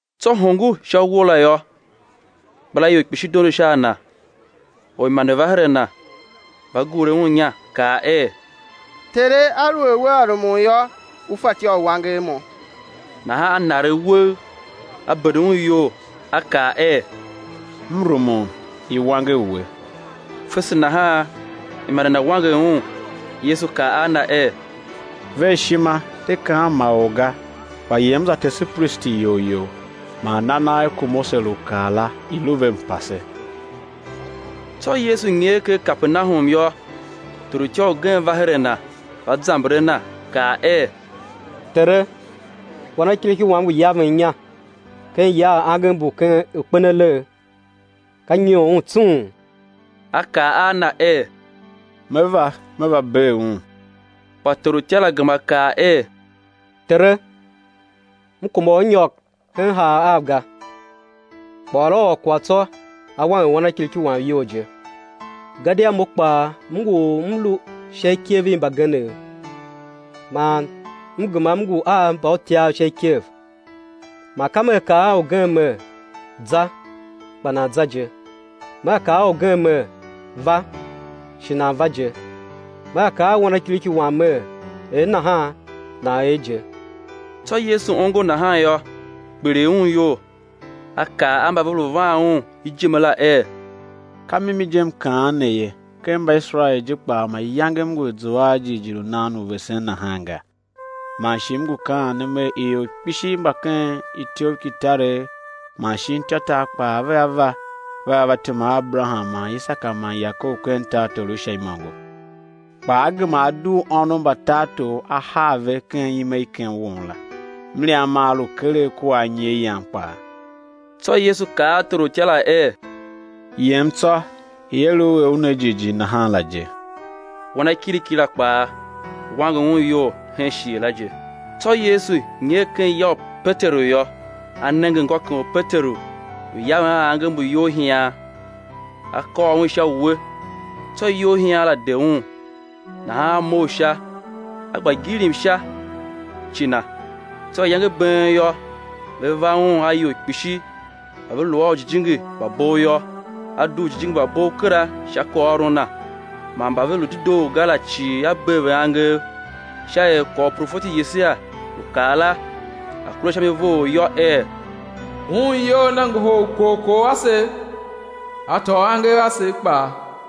Tsô hongo sha uwo la yô, ikpilaior kpishi dondo sha a Na. Orimande va her a Na, va gure Un inya, kaa er: Tere, aluer Wea rumun yô, U fatyô u wanger mo. Nahan A naregh uwegh, A bende un iyol, A kaa er: M rumun, i̱ wanger we, fese nahan imande na wanger un. Yesu kaa a na er: Ver ishima, de kaan ma or ga, kpa yem za tese pristi iyol you, man na nagh ku Mose lu kaa la, i̱ lu ve mpase. Tsô Yesu nyer ken Kapernahum yô, torutya ugen va her a Na, va zamber a Na, kaa er: Tere, wanakiriki wam ngu yaven inya ken ya a angev mbu kpen alegh, ka nyoon un tsung. A kaa a na er: Me va, Me va bee un. Kpa torutya la gema kaa er: Tere, m kuma u Ú nyôr hen haav av ga, kpa ôr a ôr kwagh tsô, á wanger wanakiriki wam iyol je. Gadia mo kpaa m ngu or u m lu sha ikev i mbagenev, man m gema m ngu a mbautyav sha ikev; man ka mea kaa a ugen mer: Za, kpa nan za je; mea kaa a ugen mer: Va, shi nan va je; mea kaa a wanakiriki wam mer: Er nahan, nan er je. Tsô Yesu ongo nahan yô, kpiligh Un iyol, A kaa a mba ve lu van Un ijime la er: Ka mimi je M kaan ne ye, ken Mbaiserael je kpaa mayange M ngu a zua a jighjigh u nan u vesen nahan ga. Man shi M ngu kaan ne Mer, ior kpishi mba ken ityoughkitaregh man shin ityôtar kpaa, vea va, vea va tema a Aberaham man Isaka man Yakob ken tartor u Sha imôngo, kpa á gema á dugh ônov mba tartor á haa ve ken ime i ken won la; mliam maa lu keregh kua anyi a yan kpaa. Tsô Yesu kaa a torutya la er: Yem tsô, i̱ er u er u ne jighjigh nahan la je. Wanakiriki la kpaa, wanger un iyol hen shighe la je. Tsô Yesu nyer ken ya u Peteru yô, A nenge ngôkem u Peteru lu yaven a angev mbu iyolhian. A kôr un sha uwe, tsô iyolhian la de un; nahan a mough sha, a gba gilim sha ci Na. Tsô iyange i been yô, ve va Un a ior kpishi mba ve lu a ujijingi mba bov yô; A dugh ujijingi mba bov kera sha kwaghôron Na, man mba ve lu dedoo ga la cii A bee ve angev; sha er kwagh u profeti Yesaia lu kaa la, a̱ kure sha mi vough yô, er: Un iyol Na ngohol ukorkor asev, A tôô angev asev kpaa.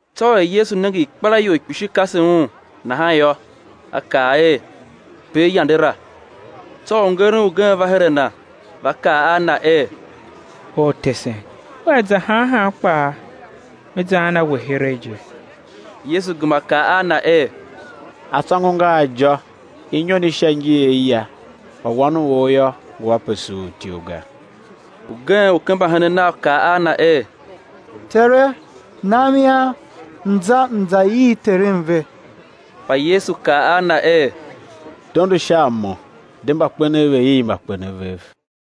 Tsô er Yesu nenge ikpelaior kpishi kase Un, nahan yô, A kaa er, i̱ per yande la. Tsô orngeren ugen va her a Na, va kaa a Na er: Ortesen, Wea za han han kpaa, me zaan a We heregh je. Yesu gema kaa a na er: Atsôngo nga a ijô, inyon i sha ngi a aya, kpa Wan u or yô, ngu ape suur ityough ga. Ugen u ken mbahenen Nav kaa a Na er: Tere, nam ian, m̱ za m za ii terem ve. Kpa Yesu kaa a na er: Dondo sha a Mo, de mbakpenev ve̱ ii mbakpenev vev.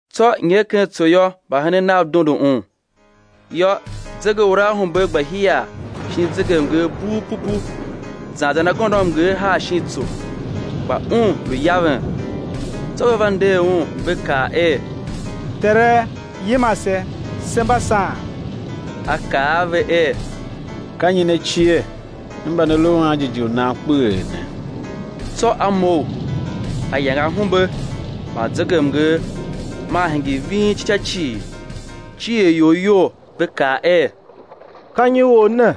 Tsô, nyer ken tso yô, mbahenen Nav dondo Un. Yô, zegeuraahumbe gba hiar shin zegemnger bughupupu zan zan agôndoamnger haa shin tso; kpa Un lu yaven. Tsô ve va nder Un, ve kaa er: Tere, yima se, se mba saan! A kaa a ve er: Ka nyi ne cie, ne mba ne lu a anjighjigh u nan kpeghee ne? Tsô A mough, A yange ahumbe man zegemnger, maa hingir ving ci ca cii. Cier ior iyol, ve kaa er: Ka nyi Or ne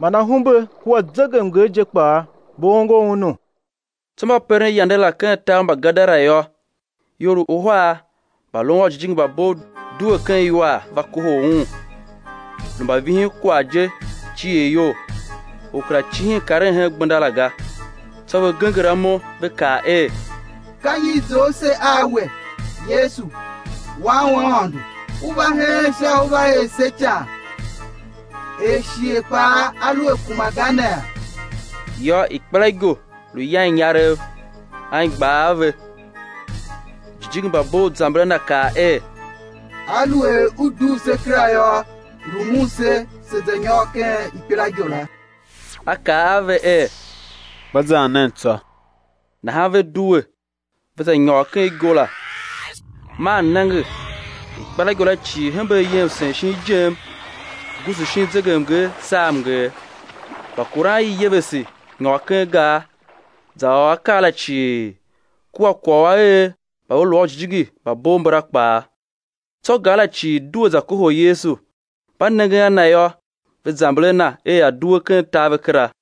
man ahumbe kua zegemnger je kpaa ve ongo Unu? Tsô mba peren yande la ken tar u Mbagadara yô, ior uhar mba lun a ujijingi mba bov due ken iwar va kohol Un, lu mbavihinkwagh je cier iyol, or kera cihin karen hen gbenda la ga. Tsô ve genger amo, ve kaa er: Ka nyi i zough se a We, Yesu, Wan u Aôndo? U va heen sha u Ú va er se ican, er shighe kpaa a lu a kuma ga nee? Yô, ikpelaigo lu yan inyarev, anigbar a ve. Ujijingi mba bov zamber a Na kaa er: Aluer U dugh se kera yô, rumun se, se̱ za nyôr ken ikpelaigo la. A kaa a ve er: Gba zan nen tsô. Nahan ve due, ve za nyôr ken igo la; man nenge ikpelaigo la cii hembe ayem sen shin ijem, guusu shin zegemnger, saa mnger. Mbakuran i yevese, nyôr ken gar, za ôr akaa la cii, kua kwagh u a er mba ve lu a ujijingi mba bov mbala kpaa. Tsô gar la cii due za kohol Yesu; mba nengen a Na yô, ve zamber a Na er A̱ due ken tar ve kera.